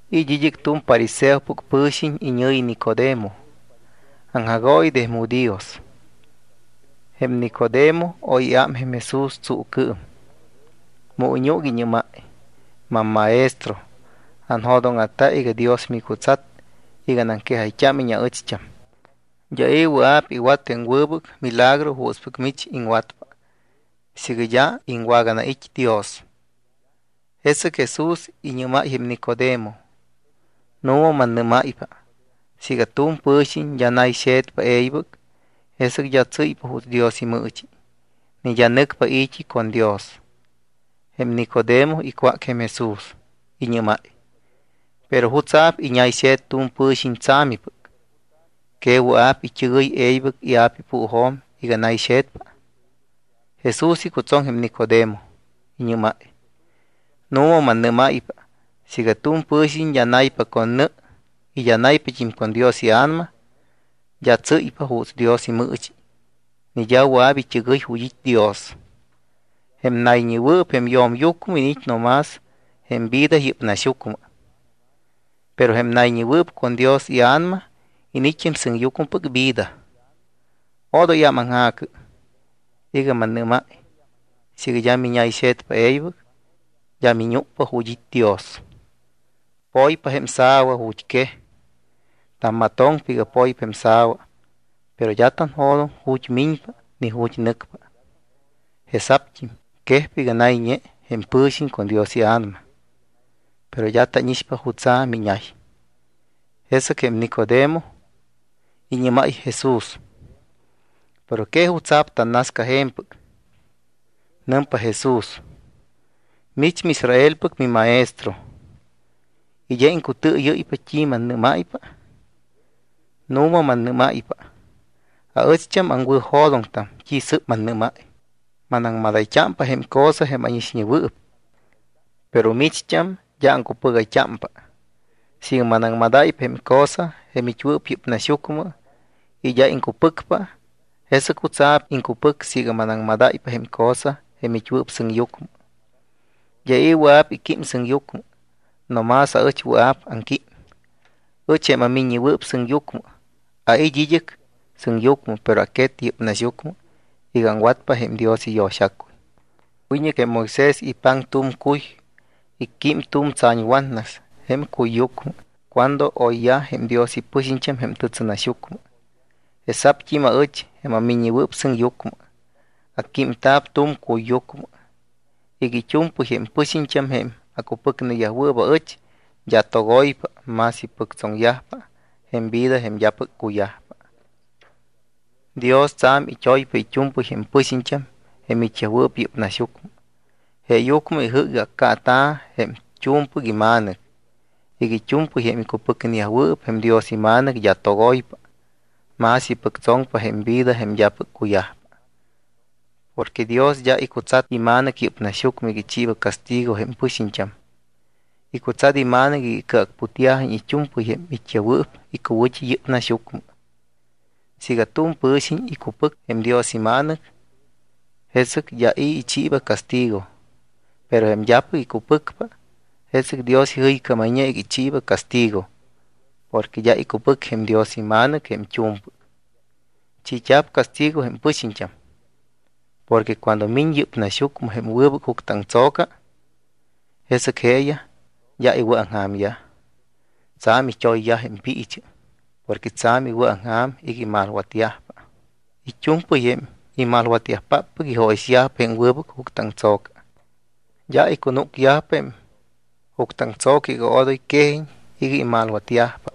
It́ id́ɨc tu̱m fariseopɨc pɨ̱xiñ iñɨ̱yi Nicodemo, aŋjagooyi de jém judíos. Jém Nicodemo oy iám jém Jesús tsuucɨɨm. Mu iñúc, iñɨ́máy: —MamMaestro, anjo̱dóŋa̱ta iga Dios micutsat iga anaŋquejayt́ámiñ aɨcht́am. D́a i̱ wɨa̱p iwat jém wɨbɨc milagro juutspɨc mich iŋwatpa siiga d́a iŋwaganait́ Dios. Jesɨc Jesús iñɨ́máy jém Nicodemo: —Nu̱ma mannɨ́máypa siiga tu̱m pɨ̱xiñ d́a nayxe̱tpa e̱ybɨc, jesɨc d́a tsɨ́ypa juuts Dios imɨɨchi ni d́a nɨcpa i̱t́i con Dios. Jém Nicodemo icwác jém Jesús. Iñɨ́máy: —¿Pero jutsa̱p iñayxe̱t tu̱m pɨ̱xiñ tsa̱mipɨc? ¿Que wɨa̱p it́ɨgɨy e̱ybɨc jém ia̱pa ipuujo̱m iga nayxe̱tpa? Jesús icutsoŋ jém Nicodemo. Iñɨ́máy: —Nu̱ma mannɨ́máypa siiga tu̱m pɨ̱xiñ d́a naypa con nɨ y d́a naypat́im con Dios iA̱nama, d́a tsɨ́ypa juuts Dios imɨɨchi ni d́a wɨa̱p it́ɨgɨy ju̱t́ it́ Dios. Jém nayñewɨɨp jém yo̱myucmɨ iniit́ no más jém vida yɨ́p naxyucmɨ. Pero jém nayñewɨɨp con Dios iA̱nama iniit́ jém sɨŋyucmɨpɨc vida. Odoy ámaŋja̱cɨ iga mannɨ́máy iga siiga d́a miñayxe̱tpa e̱ybɨc d́a miñúcpa ju̱t́ it́ Dios. Poypa jém sa̱wa ju̱t́ quej. Tammatoŋpa iga poypa jém sa̱wa, pero d́a tanjo̱doŋ ju̱t́ miñpa ni ju̱t́ nɨcpa. Jesa̱pt́im quejpa iga nayñe jém pɨ̱xiñ con Dios iA̱nama. Pero d́a tánixpa jutsa̱ miñay. Jesɨc jém Nicodemo iñɨ́máy jém Jesús: —¿Pero que jutsa̱p tannasca je̱mpɨc? Nɨmpa Jesús: —¿Que mich miIsraelpɨc mimaestro y d́a iŋcutɨɨyɨ́ypa t́i mannɨ́máypa? Nu̱ma mannɨ́máypa aɨcht́am aŋwɨ̱jo̱doŋtam t́i sɨ́p mannɨ́máy. Manaŋmadayt́ámpa jém cosa jém ánixñewɨɨp. Pero micht́am d́a aŋcupɨgayt́ámpa. Siiga manaŋmadáypa jém cosa jém it́wɨɨp yɨ́p naxyucmɨ y d́a iŋcupɨcpa, ¿jesɨc jutsa̱p iŋcupɨc siiga manaŋmadáypa jém cosa jém it́wɨɨp sɨŋyucmɨ? ’D́a i̱ wɨa̱p iquím sɨŋyucmɨ, no más ɨch wɨa̱p aŋquím. Ɨch jém aMiññewɨɨp Sɨŋyucmɨ, ait́ id́ɨc sɨŋyucmɨ, pero aquet yɨ́p naxyucmɨ iga aŋwatpa jém Dios iyo̱xacuy. Wiñɨc jém Moisés ipaŋpa tu̱m cuy, icquím tu̱m tsa̱ñwatnas jém cuyyucmɨ cuando oyyaj jém Dios ipɨxiñt́am jém tɨtsɨnaxyucmɨ. Jesa̱pt́im aɨch, jém aMiññewɨɨp Sɨŋyucmɨ, acquímta̱p tu̱m cuyyucmɨ iga it́u̱mpɨy jém pɨxiñt́am, jém acupɨcneyajwɨɨp aɨch, d́a togoypa, mas ipɨctsoŋyajpa jém vida jém d́apɨc cuyajpa. ’Dios tsa̱m it́oypa it́u̱mpɨy jém pɨxiñt́am jém it́yajwɨɨp yɨ́p naxyucmɨ. Jeeyucmɨ ijɨ́c iga accaata̱ jém t́u̱mpɨc iMa̱nɨc iga it́u̱mpɨy jém icupɨcneyajwɨɨp jém Dios iMa̱nɨc d́a togoypa, mas ipɨctsoŋpa jém vida jém d́apɨc cuyajpa. Porque Dios d́a icutsat iMa̱nɨc yɨ́p naxyucmɨ iga ichiiba castigo jém pɨxiñt́am. Icutsat iMa̱nɨc iga icɨacputyajiñ it́u̱mpɨy jém it́yajwɨɨp icuwɨ̱t́i yɨ́p naxyucmɨ. ’Siiga tu̱m pɨ̱xiñ icupɨc jém Dios iMa̱nɨc, jesɨc d́a i̱ ichiiba castigo. Pero jém d́apɨc icupɨcpa, jesɨc Dios ijɨycámayñe iga ichiiba castigo porque d́a icupɨcpa jém Dios iMa̱nɨc jém t́u̱mpɨc. Chiit́a̱p castigo jém pɨxiñt́am porque cuando miñ yɨ́p naxyucmɨ jém wɨbɨc juctɨaŋtso̱ca, jesɨc jeeyaj d́a iwɨ̱aŋja̱myaj. Tsa̱m it́oyyajpa jém piichɨ porque tsa̱m iwɨ̱aŋja̱m iga imalwatyajpa. It́u̱mpɨy jém imalwatyajpáppɨc ijóyixyajpa jém wɨbɨc juctɨaŋtso̱ca. D́a icunúcyajpa jém juctɨaŋtso̱ca iga odoy quejiñ iga imalwatyajpa.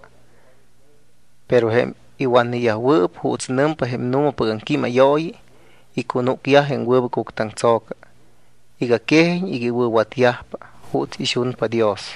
Pero jém iwatneyajwɨɨp juuts nɨmpa jém nu̱mapɨc aŋquímayooyi, icunúcyaj jém wɨbɨc juctɨaŋtso̱ca iga quejiñ iga iwɨ̱watyajpa juuts ixunpa Dios.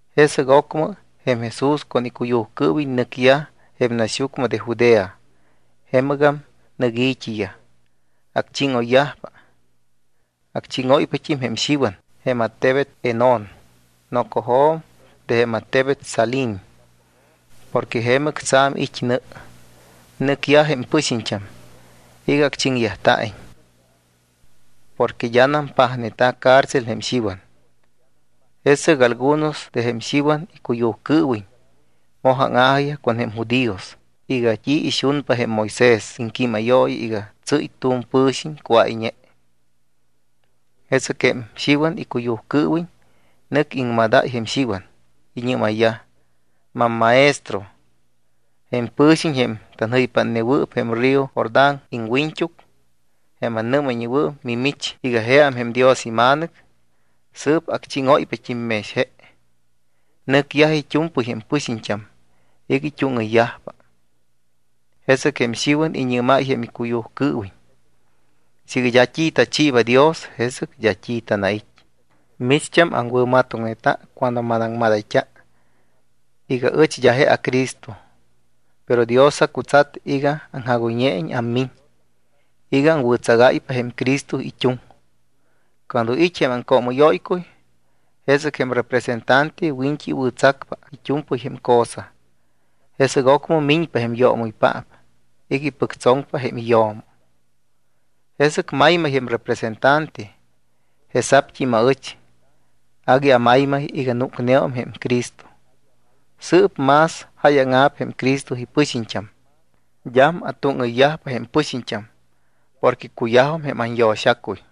Jesɨc ocmɨ jém Jesús con icuyujcɨɨwiñ nɨcyaj jém naxyucmɨ de Judea. Jemɨgam nɨc i̱t́iyaj. Acchíŋoyyajpa. Acchíŋóypat́im jém Xiwan jém attebet Enón nocojo̱m de jém attebet Salim porque jemɨc tsa̱m it́ nɨ. Nɨcyaj jém pɨxiñt́am iga acchiŋyajta̱iñ. Porque d́anam pajneta̱ cárcel jém Xiwan. Jesɨc algunos de jém Xiwan icuyujcɨɨwiñ moj áŋa̱jiyaj con jém judíos iga t́i ixunpa jém Moisés iŋquímayooyi iga tsɨ́y tu̱m pɨ̱xiñ cuáyñe. Jesɨc jém Xiwan icuyujcɨɨwiñ nɨc iŋmadayyaj jém Xiwan. Iñɨ́mayyaj: —Mammaestro, jém pɨ̱xiñ jém tanjɨypátnewɨɨp jém Jordán iŋwiñt́uc, jém annɨ́mayñewɨɨp mimich iga jeam jém Dios iMa̱nɨc, sɨɨp acchíŋóypat́im mex je. Nɨcyajpa it́u̱mpɨy jém pɨxiñt́am iga it́úŋɨyyajpa. Jesɨc jém Xiwan iñɨ́máy jém icuyujcɨɨwiñ: —Siiga d́a t́i tachiiba Dios, jesɨc d́a t́i tanait́. Micht́am aŋwɨ̱matoŋneta cuando manaŋmadayt́a iga ɨch d́a je aCristo. Pero Dios acutsat iga aŋjagoyñeiñ ammiñ iga aŋwɨ̱tsagáypa jém Cristo it́uŋ. Cuando it́ jém aŋcoomɨ́yóycuy, jesɨc jém representante wiñt́i iwɨ̱tsacpa it́u̱mpɨy jém cosa. Jesɨc ocmɨ miñpa jém yoomɨypaap iga ipɨctsoŋpa jém iyo̱mo. Jesɨc maymay jém representante. Jesa̱pt́im aɨch. Agui amaymay iga núcneum jém Cristo. Sɨɨp más jáyaŋa̱p jém Cristo ipɨxiñt́am. D́am atúŋɨyyajpa jém pɨxiñt́am porque cuyajum jém anyo̱xacuy.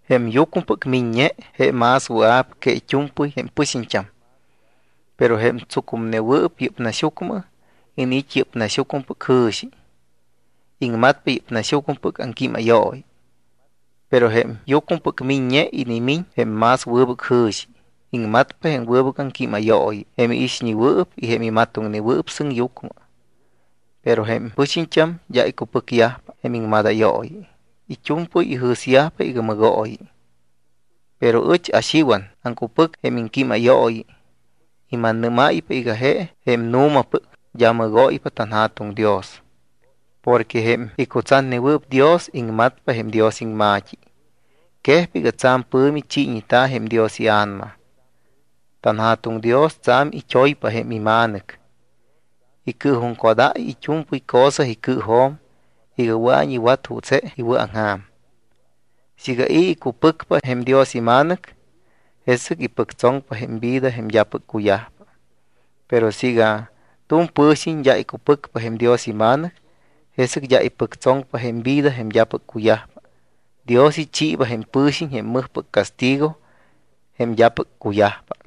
Jém yucmɨpɨc miññe, je más wɨa̱p que it́u̱mpɨy jém pɨxiñt́am. Pero jém tsucumnewɨɨp yɨ́p naxyucmɨ iniit́ yɨ́p naxyucmɨpɨc jɨ̱xi. Iŋmatpa yɨ́p naxyucmɨpɨc aŋquímayooyi. Pero jém yucmɨpɨc miññe inimiñ jém más wɨbɨc jɨ̱xi. Iŋmatpa jém wɨbɨc aŋquímayooyi jém iixñewɨɨp y jém imatoŋnewɨɨp sɨŋyucmɨ. Pero jém pɨxiñt́am d́a icupɨcyajpa jém iŋmadayooyi, it́u̱mpɨy ijɨ̱syajpa iga mɨgooyi. Pero ɨch aXiwan aŋcupɨc jém iŋquímayooyi y mannɨ́máypa iga je jém nu̱mapɨc, d́a mɨgóypa tanJa̱tuŋ Dios. Porque jém icutsatnewɨɨp Dios, iŋmatpa jém Dios iŋma̱t́i. Quejpa iga tsa̱m pɨ̱mi chiiñeta̱ jém Dios iA̱nama. TanJa̱tuŋ Dios tsa̱m it́oypa jém iMa̱nɨc. Icɨɨjuŋcodáy it́u̱mpɨy cosa icɨɨjo̱m iga wɨa̱iñ iwat juuts je iwɨ̱aŋja̱m. Siiga i̱ icupɨcpa jém Dios iMa̱nɨc, jesɨc ipɨctsoŋpa jém vida jém d́apɨc cuyajpa. Pero siiga tu̱m pɨ̱xiñ d́a icupɨcpa jém Dios iMa̱nɨc, jesɨc d́a ipɨctsoŋpa jém vida jém d́apɨc cuyajpa. Dios ichiiba jém pɨ̱xiñ jém mɨjpɨc castigo jém d́apɨc cuyajpa.